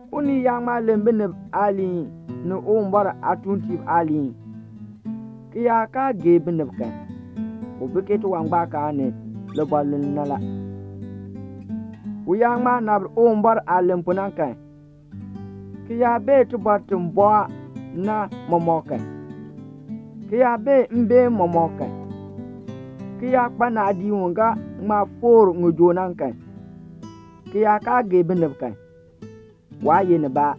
Unii yaa ŋma len binib aaliin ni Uwumbɔr aatuuntiib aaliin, ki yaa kaa gee binib kan, u bi ke tiwangbaakaan ni libɔluln na la. U yaa ŋma nabr Uwumbɔr aah len pu na kan, ki yaa bee tibɔr ti bɔɔ na mɔmɔk kan, ki yaa bee mbeen mɔmɔk kan, ki yaa kpa naadii u ga ŋma foor ŋijoo na kan, ki yaa kaa gee binib kan, waa ye nibaa.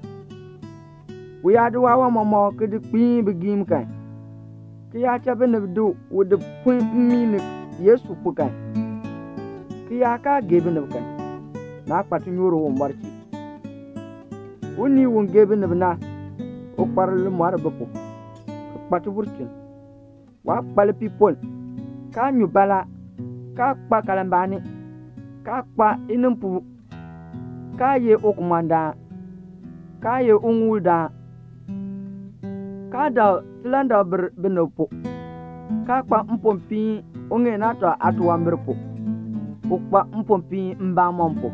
U yaa di waawan mɔmɔk ki di kpiin bigiim kan, ki yaa cha binib di u di pun mmii ni Yesu pu kan, ki yaa kaa gee binib kan, naa kpa tinyoor Uwumbɔr chee. Unii u gee binib na, u kpa limɔr bi pu, ki kpa tibulchin. Waa kpa lipiipoln, kaa nyu baalaa, kaa kpa kalmbaani, kaa kpa inimpoo, kaa ye ukumɔndaan, kaa ye uŋuuldaan, kaa dak tilandakbir binib pu, kaa kpa mpopiin uŋeen aatɔ aatunwambir pu; u kpa mpopiin mbamɔn pu.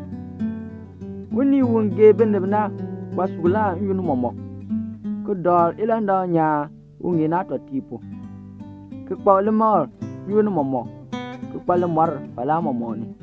Unii u gee binib na kpa suklaa n-yoonn mɔmɔk, ki dakl ilandak nyaan uŋeen aatɔtiib pu, ki kpa limakl n-yoonn mɔmɔk, ki kpa limɔr falaa mɔmɔk ni.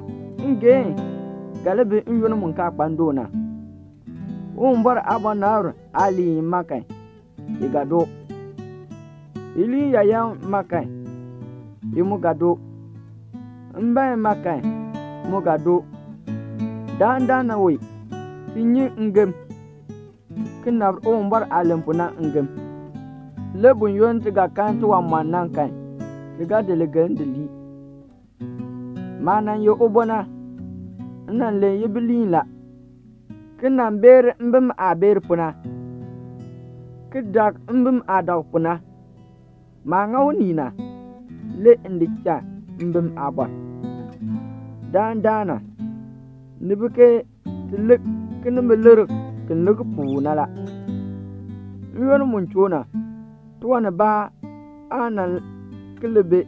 Ngeehn ga li bi n-yoonn mu kaa kpa ndoon na. Uwumbɔr aabɔnabr aaliin ma kan, i ga doo. Iliin yaayan ma kan, i mu ga doo. Mbeen ma kan, mu ga doo. Dandana wee ti nyi ngem, ki nabr Uwumbɔr aah len pu na ngem; le buyoonn ti ga kan tiwanmɔn na kan, ti ga di ligeln di lii. Maah nan ye ubo na, m nan len ibiliin la, ki nan beer mbim aah beer pu na, ki dak mbim aah dak pu na la. Maah ŋa unii na, le m di cha mbim aabɔr. Dandana, ni bi ke ti lik kinimbilikr, ki lik puu na la; n-yoonn mu choo na, tiwan nibaa aan nan ki li bi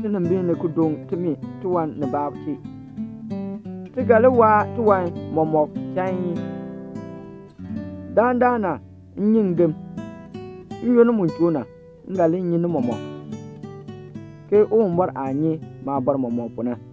tinimbiin ni ki doŋ timi tiwan nibaa chee. Ti ga li waa tiwan mɔmɔk chain. Dandana m nyi ngem. N-yoonn mu choo na, m ga li nyi ni mɔmɔk, ke Uwumbɔr aah nyi maabɔr mɔmɔk pu na.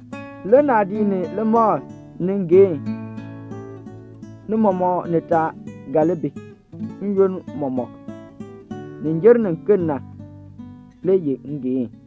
Le naadii ni limakl ni ngeehn, ni mɔmɔk nitaa ga li bi n-yoonn mɔmɔk; nin jer niken na le ye ngeehn.